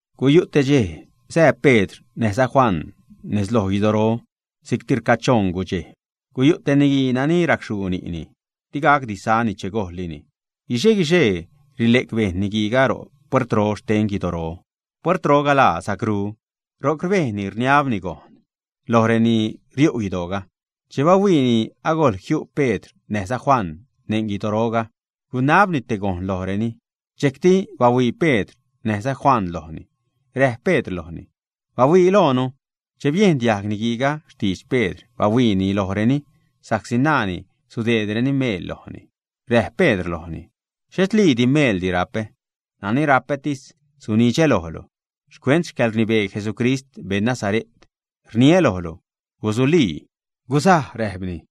Guyu' te dxej sää Pedr näjza Juan nez loj guidoro si'cti rcachoṉ gudxej. Guyu' te niguii nani racxhuu ni'ni, digacdi sani che gojllini. Guixe-guixee rile'c bejṉ niguiiga ro' puertroga xten guidoro. Puertroga laa Sacrú. Ro'c rbejni rniabni gojn lojreni riu' guidoo. Che bahuiini agojl jiu' Pedr näjza Juan neṉ guidoroga, gunabni te gojn lojreni. Dxejcti bahuii Pedr näjza Juan lojni. Räjp Pedr lojni: ―¡Bahuii loonu! Che biejn diajg niguiiga xtidx Pedr, bahuiini lojreni sa'csi naani sudeedreni meel lojni. Räjp Pedr lojni: ―Xhetliidi meeldi rapä, nani rapätis sunidxä lojlu. Xcuent xcäḻrnibee Jesucrist, beṉ Nazare't, rniä lojlu: ¡Gusulii! ¡Gusaj! ―räjpni.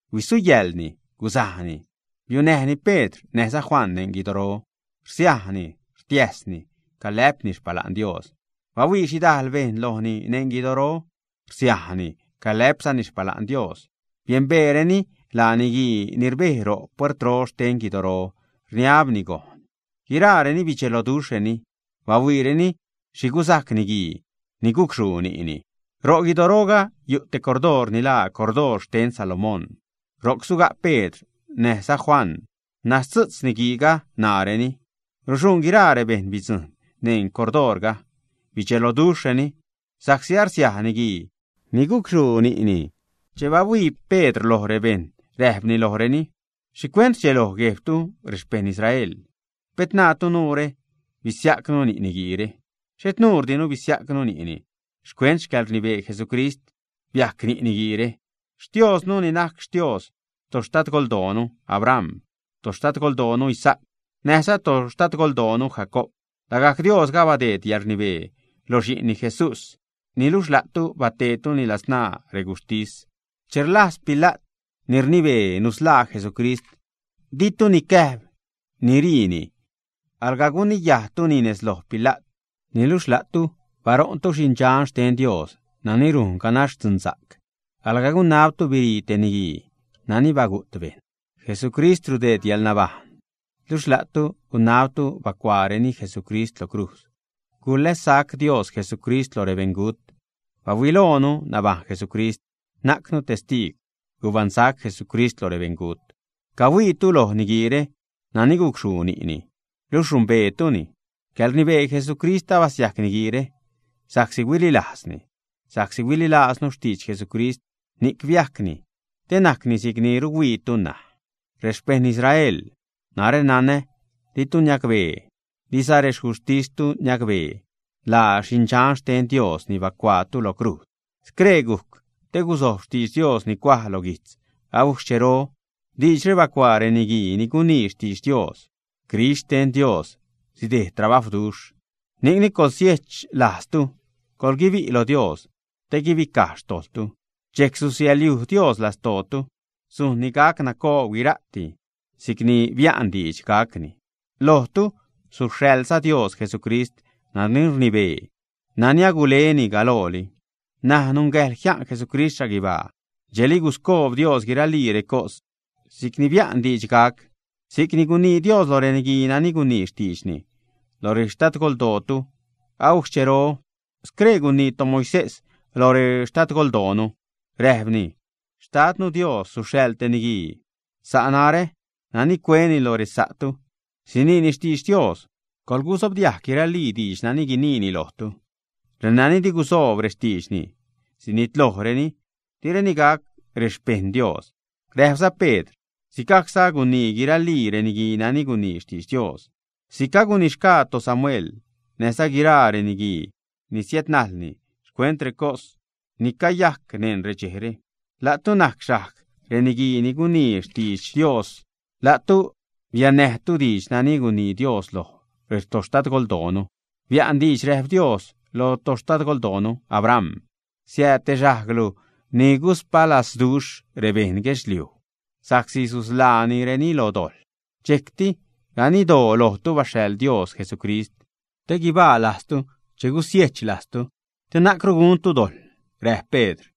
Huisuyäḻni, gusajni. Biunäjni Pedr näjza Juan neṉ guidoro. Rsiajni, rtiäsni, calä'pni xpala'n Dios. Bahuii xhidajl bejṉ lojni neṉ guidoro, rsiajni, calä'pzani xpala'n Dios. Biembeereni laa niguii ni rbej ro' puertro xten guidoro, rniabni gojn. Guiraareni bidxeloduxhreni bahuiireni xhi gusajc niguii ni gucxhuu ni'ni. Ro' guidoroga yu' te cordoor ni laa Cordoor xten Salomón. Ro'c suga' Pedr näjza Juan, naztzu'tz niguiiga ṉaareni. Ruxuṉ guiraa rebejṉ bidzujṉ neṉ cordoorga. Bidxelojreni sa'csi arsiaj niguii ni gucxhuu ni'ni. Che bahuii Pedr lo rebejṉ räjpni lojreni: ―¿Xhicuent rdxeloj guejbtu, rexpejṉ Israel? Pet naatu nuure basiajcnu ni' niguiire. Xhet nuudire basiajcnu ni'ni. Xcuent xcäḻrnibee Jesucrist biajc ni' niguiire. Xtiooznu, ni najc Xtiooz toxtadgoldoonu Abram, toxtadgoldoonu Isaac, näjza toxtadgoldoonu Jacoob, lagajc Diosga abadeed yäḻrnibee loj Xi'nni Jesús. Niluxh la'tu bateedtuni ladzṉaa reguxhtis. Che rlajz Pila't ni rnibee nusḻaa Jesucrist, ditu nicäjb niriini, alga guniyajtuni nez loj Pila't. Niluxh la'tu baṟo'ntu Xi'n Dxan xten Dios nani rujn ganax dzunsa'c. Alga gunabtu birii te niguii nani bagu't bejṉ. Jesucrist rudeed yäḻnabajṉ, luxh la'tu gunabtu bacuaareni Jesucrist lo crujz. Gulässac Dios Jesucrist lo rebeṉgut. Bahuiloonu nabajṉ Jesucrist, najcnu testiigw gubaṉsac Jesucrist lo rebeṉgut. Cahuiitu loj niguiire nani gucxhuu ni'ni, luxh rumbeetuni. Xcäḻrnibee Jesucrist abasiajc niguiire, sa'csi huililajzni. Sa'csi huililajznu xtidx Jesucrist, ni'c biajcni te najcni si'cni rhuiituni ṉaj. ’Rexpejṉ Israel, narä nanä di'tu niacbee, diza rexcuxhtistu niacbee laa Xindxan xten Dios ni bacuaatu lo crujz. Scree gujc te guzojb xtidx Dios ni cuaj lo guijtz agujc xchero. Diidxre bacuaa reniguii ni gunii xtidx Dios, Crist xten Dios sidejd trabajwduxh. Ni'cni coḻsiechlajztu, coḻguibi' loj Dios te guibicaj xtojḻtu. Dxejc susiälyuj Dios lastootu, sujnni gac nacoob guira'ti, si'cni bia'n diidx gacni. Lojtu suxhaḻza Dios Jesucrist nani rnibee, nani aguleni galooli. N̲aj nungäjḻ jia'n Jesucrist xhaguibaa dxejli guscoob Dios guiralii recos si'cni bia'n diidx gac, si'cni gunii Dios lo reniguii nani gunii xtiidxni lo retoxtadgoldootu agujc xchero. Scree gunii toMoisés lo retoxtadgoldoonu, räjpni: “Xtadnu Dios suxhaḻ te niguii sa' narä nani cueni lo resa'tu. Siniini xtidx Dios. Coḻgusobdiajg guiralii diidx nani guiniini lojtu. Renani di gusoob rextiidxni, sinitlojreni, direni gac rexpejṉ Dios.” Räjpza Pedr: ―Sigajcza agunii guiralii reniguii nani gunii xtidx Dios. Si'c agunixgaa toSamuel, näjza guiraa reniguii ni siädnajlni, xcuent recos ni cayajc neṉ redxejre. La'tu najc xajg reniguii ni gunii xtidx Dios. La'tu biannäjtu diidx nani gunii Dios loj retoxtadgoldoonu. Bia'n diidx, räjp Dios loj toxtadgoldoonu Abram: “Jiädjiajl te xajglu ni guspalazduxh rebeṉ guedxliuj, sa'csi susḻaanireni lo dojḻ.” Dxejcti ganiddoo lojtu baxhaḻ Dios Jesucrist te guibaa lajztu che gusiejch lajztu, te na'cru guntu dojḻ ―räjp Pedr.